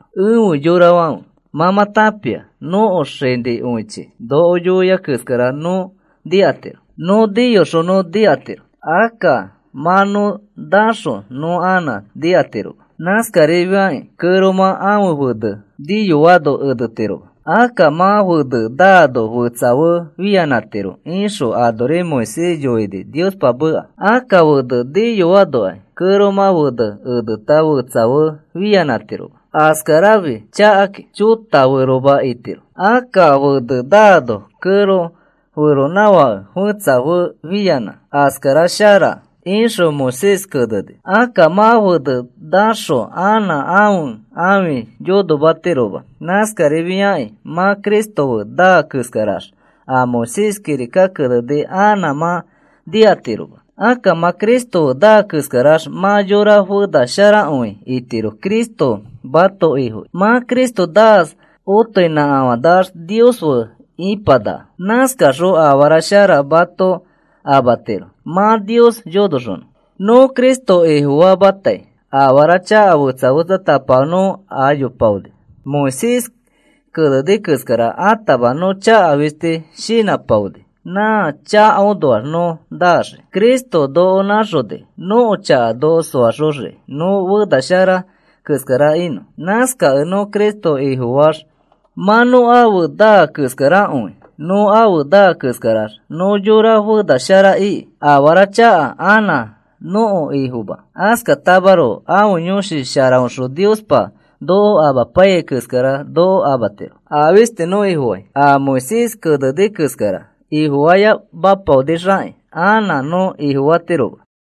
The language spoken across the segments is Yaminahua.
Efe yorafãfe, mã mã tãpia nõko xanĩfokõichi noko yoia keskara nõ nikatiro. Nõ niyoxõ nõ nikatiro. Akka mã nõ naxõ nõ anã nikatiroma. Nãskarifiai kẽromã ãfe fene niyoano enetiroma. Akka mã fene naano fetsa fe fianãtiro ixõ anori Moisés yoini Niospa meka. Akka fene niyoanokai kẽromã fene eneta fetsa fe fianãtiroma. Askarafi chakakĩ. Chota feroma itiro. Akka fene naano kẽro feronãfake fetsa fe fianã askara shara, ixõ Moisés keneni. Akka mã fenẽ naxõ anã ãfe ãfi yonomatiroma. Nãskarifiakĩ mã Cristo fe naa keskarax a Moisés kirika keneni anã mã nikatiroma. Akka mã Cristo fe naa keskarax mã yora fena sharakõi itiro Cristo mãto Ifono. Mã Cristo naax otoinãkafanax Nios fe ipanaka. Nãskaxõ afara shara mato amatiro mã Nios yonoxonõ. Nõ Cristo Ifofamatai afara chaka fetsa fetsatapafo nõ ayopaoni. Moisés keneni keskara atama nõ chaka fisti shinãpaipaoni. Nã chakaõnoax nõ naxii. Cristo noko nãxoni nõko chaka noko soaxoxiki nõ fena shara keskara inõ. Nãskakẽ nõ Cristo Ifofaax mã nõ afe naa keskarakõi. Nõ afe naa keskarax nõ yora fena shara iki. Afara chaka anã nõko ifoma. Askatamaroko ãfe Yõshi Sharaõxõ Niospa noko amapaiyai keskara noko amatiro. A fisti nõ Ifofai, a Moisés keneni keskara ifofayopaonixaki anã nõ ifofatiroma.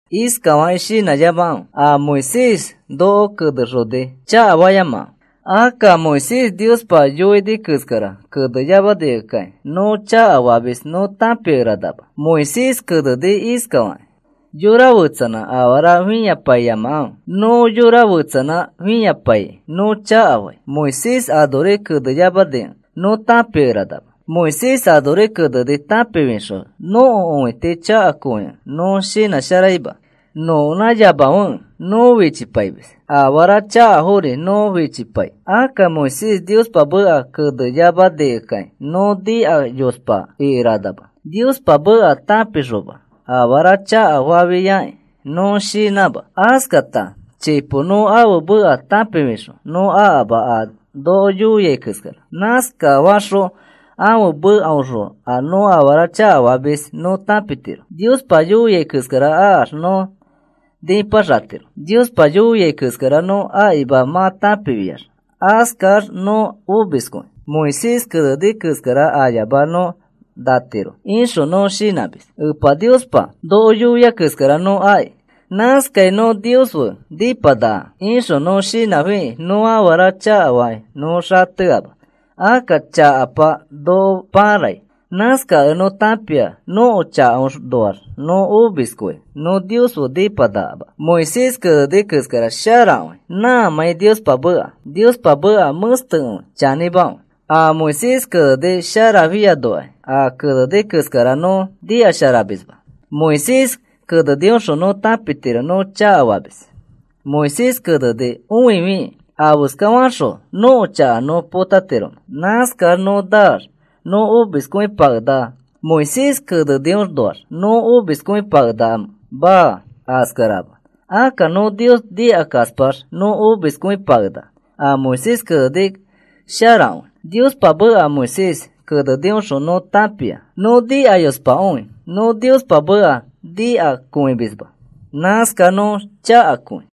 Iskafakĩ shinãyamakãfe. A Moisés noko kenexoni, chakara fayamakãfe. Akka Moisés Niospa yoini keskara keneyamanikẽkai nõ chakafamis nõ tãpikeranama. Moisés keneni iskafakĩ: “Yora fetsanã afara fĩapaiyamakãfe. Nõ yora fetsanã fĩapaikĩ nõ chakafai,” Moisés anori keneyamanikẽ nõ tãpikeranama. Moisés anori keneni tãpifixõ nõko õiti chakakõikẽ nõ shinãsharaima. Nõkonãyamafekẽ nõ fichipaimis. Afara chakafori nõ fichipai. Akka Moisés Niospa meka keneyamanikẽkai nõ nikayospa ikeranama. Niospa meka tãpixoma afara chakafafiakĩ nõ shinãma. Askata chipo nõ ãfe meka tãpifixõ nõ akama a noko yoia keskara. Nãskafaxõ ãfe mekaõxõ a nõ afara chakafamis nõ tãpitiro. Niospa yoia keskara akax nõ nipaxatiro. Niospa yoiai keskara nõ akima mã tãpifiax, askax nõ omiskõi. “Moisés keneni keskara ayamax nõ natiro,” ixõ nõ shinãmis. “Epa Niospa noko yoia keskara nõ aki. Nãskai nõ Nios fe nipanaka,” ixõ nõ shinãfikĩ nõ afara chakafakĩ nõ xateama. Akka chakapa noko pãrai. Nãskakẽ nõ tãpia nõko chakaõnoax nõ omiskõi nõ Nios fe nĩpanakama. Moisés keneni keskara sharakõi nãmãi Niospa meka. Niospa meka mẽstekõi, chanĩmakõi. A Moisés keneni sharafianokai a keneni keskara nõ nikasharamisma. Moisés kenenioxõ nõ tãpitiro nõ chakafamis. Moisés keneni õifikĩ, ¿afeskafaxõ nõko chaka nõ potatiromẽ? Nãskax nõ naax nõ omiskõipakenaka. ¿Moisés keneniõnoax nõ omiskõipakenakamẽ? Maa, askarama. Akka nõ Nios nikakaspax nõ omiskõipakenaka. A Moisés keneni sharakõi, Niospa meka. Moisés keneniõxõ nõ tãpia nõ nikayospakõi. Nõ Niospa meka nikakõimisma. Nãskax nõ chakakõi.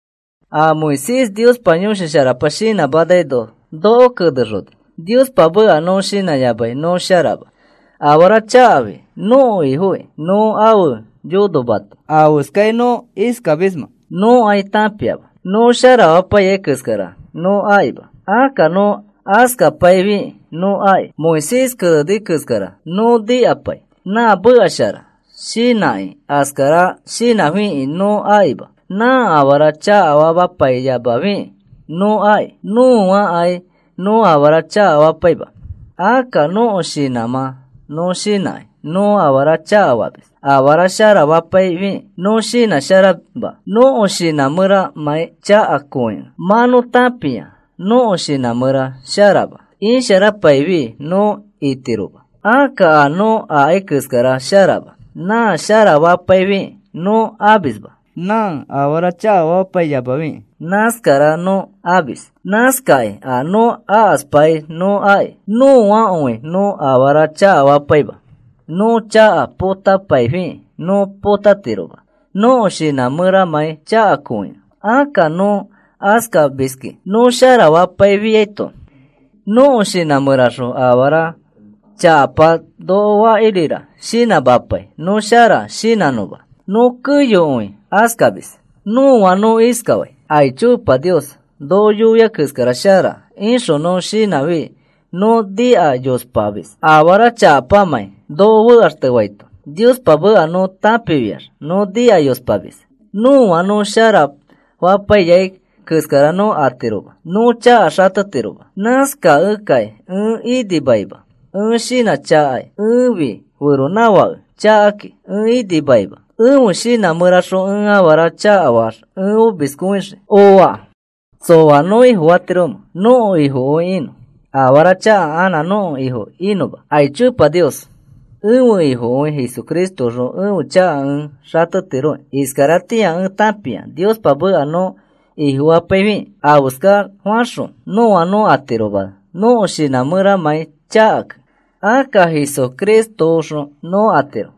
A Moisés Niospa Yõshi Sharapa shinãmanaino noko kenexoni. Niospa meka nõ shinãyamai nõ sharama. Afara chakafi nõko ifokĩ nõ ãfe yonomati. ¿Afeskai nõ iskamismẽ? Nõkai tãpiama. Nõ sharafapaiyai keskara nõ akima. Akka nõ akaspafiakĩ nõ aki. Moisés keneni keskara nõ nikapai, “Nã meka shara,” shinãkĩ. Askara shinãfiki nõ akima. Nã afara chakafapaiyamafikĩ nõ aki. Nõakai nõ afara chakafapaima. Akka nõko shinãmã nõ shinãkĩ nõ afara chakafamis. Afara sharafapaifikĩ nõ shinãsharaima, nõko shinã mẽramãi chakakõikẽ. Mã nõ tãpia nõko shinã mẽra sharama. Isharapaifi nõ itiroma. Akka a nõ akai keskara sharama. Nã sharafapaifikĩ nõ amisma. Nã afara chakafapaiyamafikĩ nãskara nõ amis. Nãskakĩ a nõ akaspai nõ aki. Nõakõi nõ afara chakafapaima. Nõ chaka potapaifikĩ nõ potatiroma nõko shinã mẽramãi chakakõikẽ. Akka nõ askamiski. Nõ sharafapaifiaito nõko shinã mẽraxõ afara chakapa noko fakirira shinãmapai nõ shara shinãnõma. Nõ keyokõi askamis. Nõa nõ iskafai: “Aicho. Niospa noko yoiai keskara shara,” ixõ nõ shinãfi nõ nikayospamis afara chakapamãi noko fekaxtefaito. Niospa meka nõ tãpifiax nõ nikayospamis. Nõa nõ sharafapaiyai keskara nõ atiroma. Nõ chaka xatetiroma. Nãskakẽkai ẽ inimaima. Ẽ shinãchakai. Ẽfi feronãfake chakakĩ. Ẽ inimaima. Ẽfe shinã mẽraxõ ẽ afara chakafaax ẽ omiskõixii. Ooa. ¿Tsõa nõ Ifofatiromẽ nõko Ifokõi inõ, afara chaka anã nõko ifo inõma? Aicho Epa Nios. Ẽfe Ifokõi Jesucristoõxõ ẽfe chaka ẽ xatetiroki. Iskaratĩa ẽ tãpia Niospa meka nõ ifofapaifikĩ afeska faxõ nõa nõ atiroma nõko shinã mẽramãi chakakẽ. Akka Jesucristoõxõ nõ atiro.